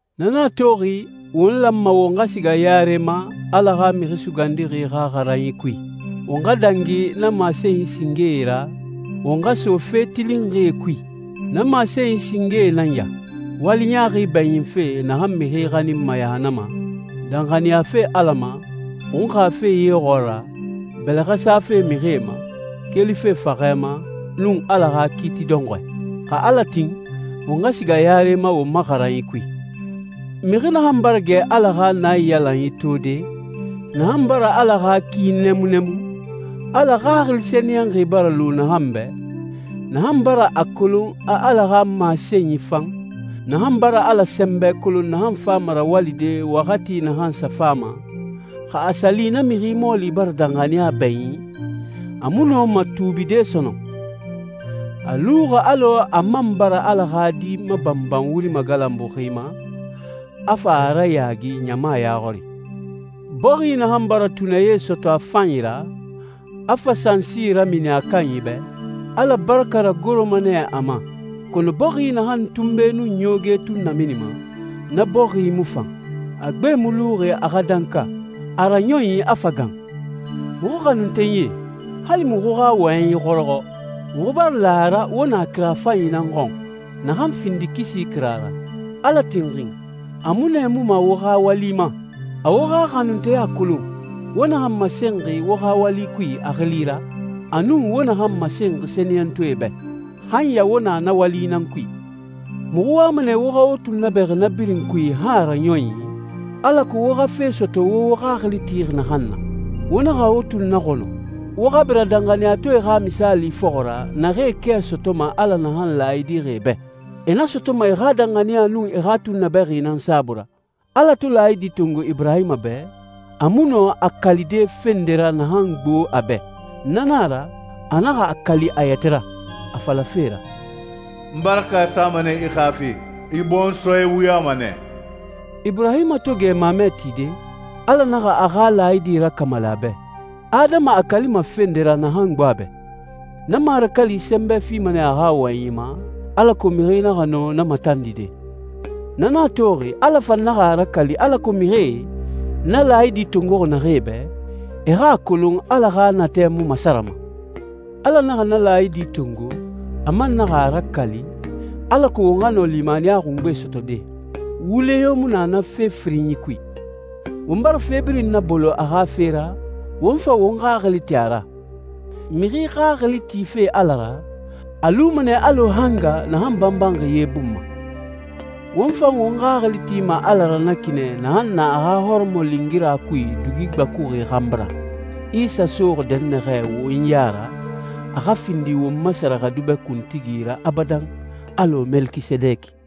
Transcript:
Na nan a toxi won lanma won xa siga yare ma Ala xa Mixi Sugandixi xa xaranyi kui. Won xa dangi na masenyi singee ra, won xa so fe tilinxie kui. Na masenyi singee nan ya: wali ɲaaxi bɛɲinfe naxan mixi xaninma yahannama, danxaniyafe Ala ma, xunxafe ye xɔɔra, bɛlɛxɛ safe mixie ma, kelife faxɛ ma, nun Ala xa kiiti dɔnxɔɛ. Xa Ala tin, won xa siga yare ma won ma xaranyi kui. Mixi naxan bara gɛ Ala xa naiyalanyi tode, naxan bara Ala xa ki nɛmunnɛmun, Ala Xaxili Sɛniyɛnxi bara lu naxan bɛ, naxan bara a kolon a Ala xa masenyi fan, naxan bara Ala sɛnbɛ kolon naxan fama rawalide waxati naxan sa fama, xa a sa li na mixi mɔɔli bara danxaniya bɛɲin, a mu nɔma tuubide sɔnɔn. A luxi alɔ a man bara Ala xa Di mabanban wuri magalanbuxi ma, a fa a rayaagi ɲama ya xɔri. Bɔxi naxan bara tunɛ ye sɔtɔ a fanyi ra, a fa sansi ramini a kanyi bɛ, Ala baraka ragoroma nɛ a ma. Kɔnɔ bɔxi naxan tunbe nun ɲooge tun naminima, na bɔxi mu fan. A gbe mu luxi a xa danka, a raɲɔnyi a fa gan. Muxu xanuntenyie, hali muxu xa wɔyɛnyi xɔrɔxɔ, muxu bara la a ra wo na kira fanyi nan xɔn, naxan findi kisi kira ra. Ala tinxin, a mu nɛɛmuma wo xa wali ma. A wo xa xanunteya kolon, wo naxan masenxi wo xa wali kui a xili ra, a nun wo naxan masenxi sɛniyɛntɔɛe bɛ. Han ya wo na na wali nan kui. Muxu wama nɛ wo xa wo tunnabɛxi na birin kui han a raɲɔnyi, alako wo xa fe sɔtɔ wo wo xaxili tixi naxan na. Wo naxa wo tunnaxɔnɔ. Wo xa bira danxaniyatɔɛe xa misaali fɔxɔ ra, naxee kɛ sɔtɔma Ala naxan laayidixi e bɛ. E na sɔtɔma e xa danxaniya nun e xa tunnabɛxi nan saabui ra. Ala to laayidi tongo Iburahima bɛ, a mu nɔ a kalide fe nde ra naxan gbo a bɛ. Na na a ra, a naxa a kali a yɛtɛ ra, a falafe ra, «N baraka sama nɛ i xa fe. I bɔnsɔɛ wuyama nɛ.» Iburahima to gɛ mamɛ tide, Ala naxa a xa laayidi rakamali a bɛ. Adama a kalima fe nde ra naxan gbo a bɛ. Na marakali sɛnbɛ fima nɛ a xa wɔyɛnyi ma, alako mixi naxa nɔ na matandide. Na nan a toxi, Ala fan naxa a rakali alako mixie, na laayidi tongoxi naxee bɛ, e xa a kolon Ala xa natɛ mu masarama. Ala naxa na laayidi tongo, a man naxa a rakali, alako won xa nɔ limaniya xungbe sɔtɔde. Wule yo mu na na fe firinyi kui. Won bara fe birin nabolo a xa fe ra, won fa won xaxili ti a ra. Mixi xaxili tife Ala ra, a luma nɛ alɔ hanga naxan banbanxi ye bun ma. Won fan won xaxili tima Ala ra na ki nɛ naxan na a xa hɔrɔmɔlingira kui dugi gbakuxi xanbi ra, Isa soxi dɛnnaxɛ won ya ra, a xa findi won ma sɛrɛxɛdubɛ kuntigi ra abadan, alɔ Melekisedeki.